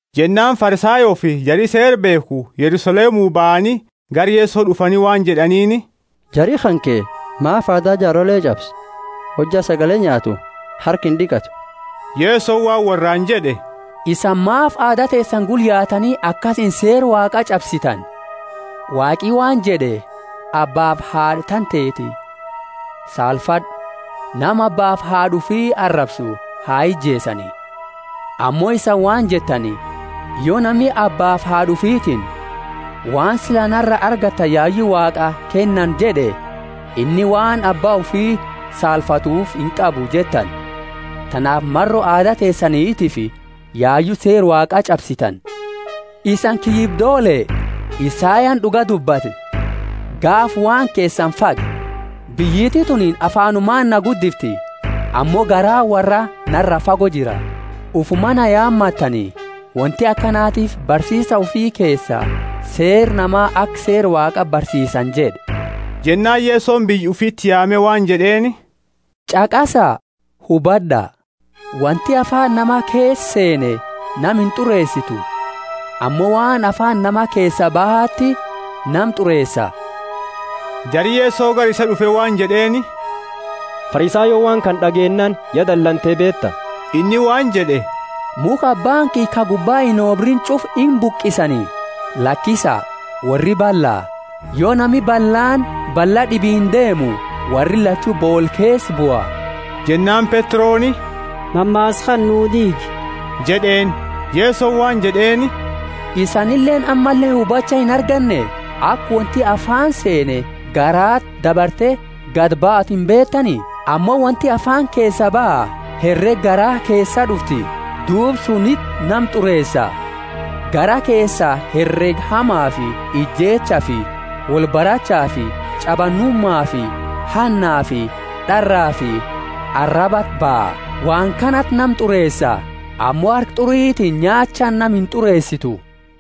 Jennaani Farisayoofi jari Seera beekhu Yerusalemu bahani gara Yeso d'ufani waan jed'aniini, Jari kanke maafi aada jaarole ch'absa? Hojja sagale nyaatu harka ind'iqatu. Yesoni waan worraani jed'e, Isani maafi aada teesani gula yaatani akasiini seera Waaqa ch'absitani? Waaqi waan jed'e, Abbaafi haad'a tanteti saalfad'u; nama abbaafi haad'a ufi arabsu ha ijeesani. Ammo isani waan jettani, Yo nami abbaafi haad'a ufitiini, waan sila nara argattani yayu Waaqaa kennani jed'e, inni waan abba ufi saalfatuufi inqabu jettani. Tanaafi maro aada teesanitiifi yayu seera Waaqa ch'absitani. Isani kiyyibdoole! Isayani d'uga dubbate, gaafa waan keesani fage! Biyyiti tunini afaanumaani na guddifti, ammo garaani worra nara fago jira. Ufuma na yaamatani, wonti akanatiifi barsiisa ufi keesa seera nama aka seera Waaqa barsiisani jed'e. Jennaani Yesoni biyya ufiti yaame waan jed'eeni, Ch'aqasa, hubad'a. Wonti afaani nama keesa seene nama int'ureesitu, ammo waan afaani nama keesaa bahati nama t'ureesa. Jari Yeso gara isaa d'ufe waan jed'eeni, Farisayooni waan kana d'ageennaani ya dalante, beeta? Inni waan jed'e, Mukha Abbaani kiyya ka gubba inobriini ch'ufa imbuqisani. Lakisa, worri balla. Yo nami ballaani balla d'ibiini deemu, worri lachu boola keesa bua. Jennaani Petroni, Mammaasa kana nu diigi jed'eeni. Yesoni waan jed'eeni, Isanileeni ammalle hubacha inarganne? Aka wonti afaani seene garaati dabarte gadi baatu imbeetani? Ammo wonti afaani keesa baha, herega garaa keesaa d'ufti Duuba suniti nama t'ureesa. Garaa keesaa herega hamafi ijeechafi wolbarachaafi ch'abanumafi hannafi d'arafi arabati baha. Waan kanati nama t'ureesa. Ammo harka t'uritiini nyaachaani nama int'ureesitu.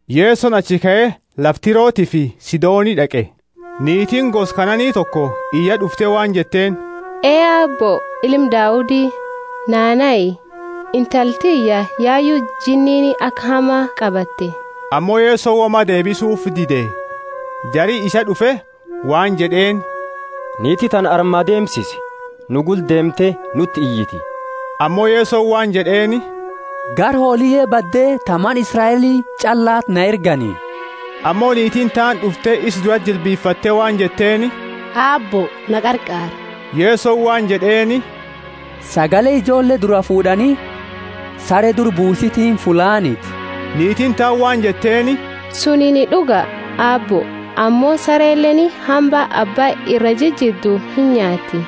Yesoni achi kae lafa Tirotiifi Sidoni d'aqe. Niitiini gosa Kanaani toko iyaa d'ufte waan jetteeni, Ee Aabbo, Ilma Daudi, naa nahi, intala tiyya yayu jinniini aka hama qabatte. Ammo Yesoni woma deebisufi dide. Jari isa d'ufe waan jed'eeni, Niiti tana arma deemsisi, nu gula deemte nuti iyiti. Ammo Yesoni waan jed'eeni, Gara hooliye badde ta mana Israeli ch'allati na ergani. Ammo niitiini taani d'ufte isa durati jilbifatte waan jetteeni, Aabbo, na qarqaari. Yesoni waan jed'eeni, Sagale ijoolle duraa fuud'ani sare duraa buusitiini fullaaniti. Niitiini taani waan jetteeni, Sunini d'uga, Aabbo; ammo sareleeni hamba abba iraa jijiddu inyaatti.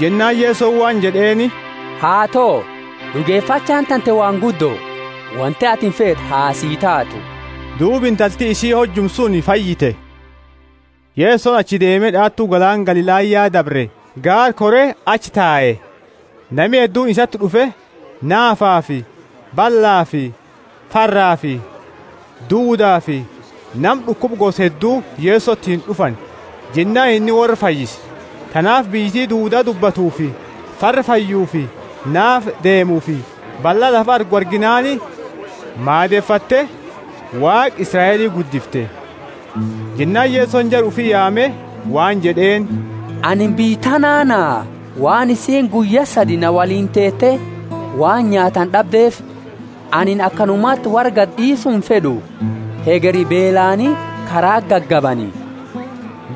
Jennaani Yesoni waan jed'eeni, Haato, d'ugefachaani tante waan guddo. Wonti atini feetu ha sii taatu. Duuba intalti isii hojuma suni fayyite. Yesoni achi deeme d'aatu galaana Galilaya dabre, gaara kore achi tae. Nami hedduuni isati d'ufe, naafafi ballafi farrafi duudafi nama d'ukuba gosa heddu Yesotiini d'ufani, jennaani inni worra fayyise. Tanaafi biyyiti duuda dubbatufi farra fayyufi naafa deemuufi balla lafa argu arginaani maadefatte, Waaqa Israeli guddifte. Jennaani Yesoni jara ufi yaame waan jed'eeni, Anini biyya tanaa naha, waan isiini guyya sadi na woliini teete waan nyaatani d'abdeefi. Anini akanumati worra gadi d'iisu imfed'u, hegeri beelaani karaati gagabani.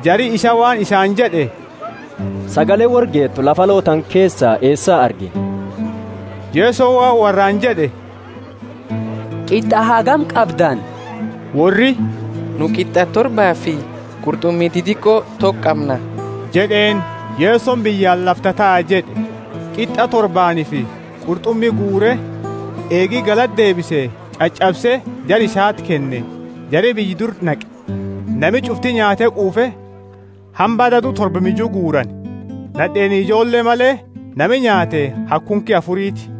Jari isaa waan isaani jed'e, Sagale worra geetu lafa aloo tana keesa eesa argina? Yesoni waan worraani jed'e, Qit'a hagami qabdani? Worri, Nu qit'a torbaafi qurt'umi didiqo toko qamna jed'eeni. Yesoni biyyaani, Lafa tataa jed'e, qit'a torbaanifi qurt'umi guure, eegi galata deebise ch'ach'abse, jara isati kenne. Jari biyya dura naqe. Nami ch'ufti nyaate quufe, hamba dadu torba miju guurani. Nad'eeni ijoolle male, nami nyaate haga kunki afuriti.